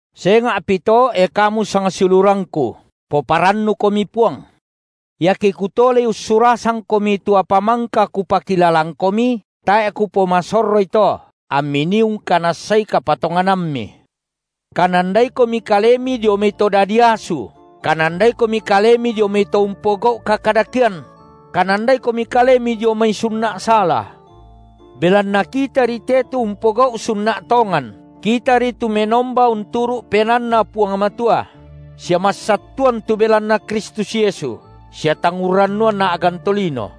Senga’pi to, e kamu sangsiulurangku, poparannukomi Puang. Iake kutolei ussurasangkomi tu apa mangka kupakilalangkomi, tae’ kupomasorroi to, ammi nii ungkanassai kapatonganammi. Kanandaikomi kalemi dio mai to dadi asu; kanandaikomi kalemi dio mai to umpogau’ kakadakean; kanandaikomi kalemi dio mai sunna’ sala. Belanna kitari te tu umpogau’ sunna’ tongan, kitari tu menomba unturu’ PenaanNa Puang Matua, sia massattuan tu belanna Kristus Yesu, sia tang urrannuan a’gan tolino;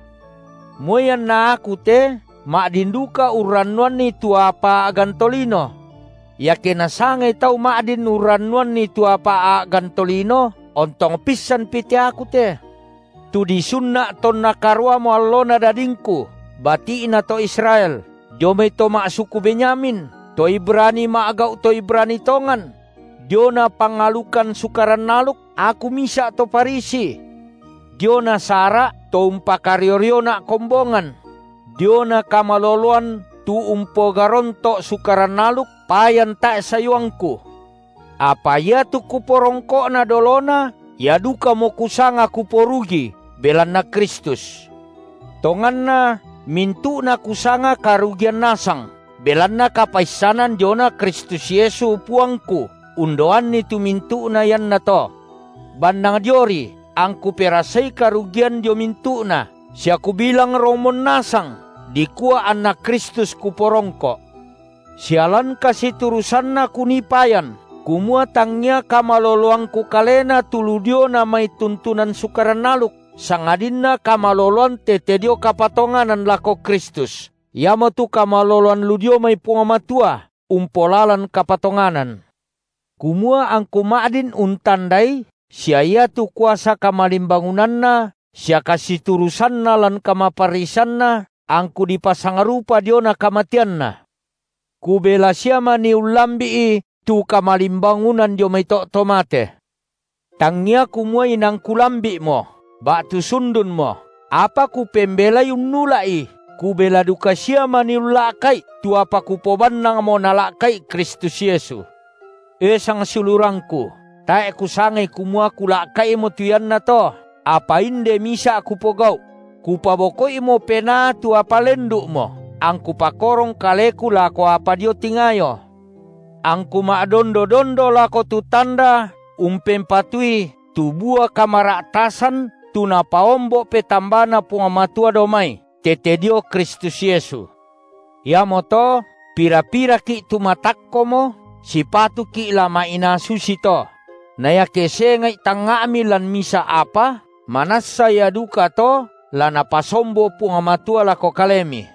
moi anna aku te ma’din duka urrannuanni tu apa a’gan tolino. Iake nasangai tau ma’din urrannuanni tu apa a’gan tolino, ontong pissanpi te aku te, tu disunna’ tonna karuamo allona dadingku, bati’na to Israel, dio mai to ma’suku Benyamin, to Ibrani ma’gau’ to Ibrani tongan; diona pangalukan Sukaran aluk, aku misa’ to Farisi; diona sara’, to umpakario-riona’ kombongan; diona kamaloloan tu umpogaronto’ Sukaran aluk, payan tae’ sayuangku. Apa iatu kuporongko’na dolona, ia dukamo kusanga kuporugi belanna Kristus. Tonganna mintu’na kusanga karugian nasang, belanna kapaissanan diona Kristus Yesu, Puangku undaoanni tu mintu’na iannato. Bannang dioRi angku perasai karugian dio mintu’na, sia kubilang romon nasang, dikua anNa Kristus kuporongko’, sia lan kasiturusanNa kunii payan, kumua tangia kamaloloangku kalena tu lu diona mai tuntunan Sukaran aluk, sangadinna kamaloloan tete dio kapatonganan lako Kristus, iamotu kamaloloan lu dio mai Puang Matua umpolalan kapatonganan. Kumua angku ma’din untandai sia iatu kuasa kamalimbangunanNa sia kasiturusanNa lan kamaparrisanNa, angku dipasangrupa diona kamateanNa, kubela sia manii ullambi’i tu kamalimbangunan dio mai to’ to mate. Tangia kumua inang kulambi’mo, ba’tu sundunmo, apa kupembelai unnula’i, kubela duka sia manii ulla’ka’i tu apa kupobannangmo Nala’ka’i Kristus Yesu. E sangsiulurangku, tae’ kusangai kumua kulaka’imo tu iannato, apa inde misa’ kupogau’: kupaboko’imo penaa tu apa lendu’mo, angku pakorong kaleku lako apa dio tingayo, angku ma’dondo-dondo lako tu tanda umpempatui tu bua kamara’tasan tu napaombo’ petambaNa Puang Matua dao mai, tete dio Kristus Yesu. Iamoto, pira-piraki’ tu matakkomo, sipatuki’ la ma’inaa susito; na iake senga’i tangnga’mi lan misa’ apa, manassa ia dukato la Napasombo Puang Matua lako kalemi.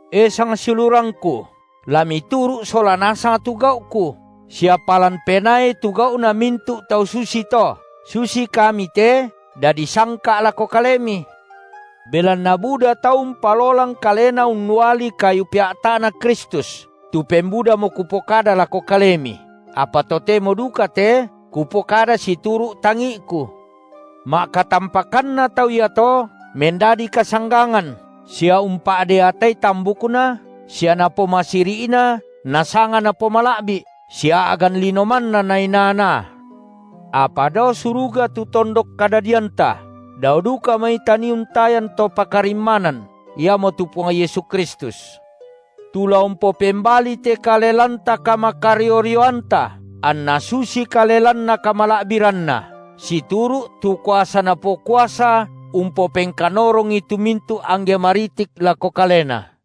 E sangsiulurangku, la mituru’ sola nasang tu gau’ku, sia palan penaai tu gau’na mintu’ tau susito, susi kami te dadi sangka’ lako kalemi. Belanna buda tau umpalolang kalena unnuali kayu pea’ta’Na Kristus, tu pembudamo kupokada lako kalemi, apa totemo duka te kupokada situru’ tangi’ku. Ma’katampakanna tau iato mendadi kasanggangan, sia umpa’deatai tambukna, sia napomasiri’na nasanga napomala’bi’, sia a’gan lino manna nainaa-naa. Apa dao suruga tu tondok kadadianta, dao duka mai tanii untayan To pakarimmanan, Iamotu Puang Yesu Kristus, tu la umpopembali te kale lanta kamakario-rioanta, anna susi kale lanNa kamala’biranNa, situru’ tu kuasa Napokuasa umpopengkanorongi tu mintu’ angge maritik lako Kalena.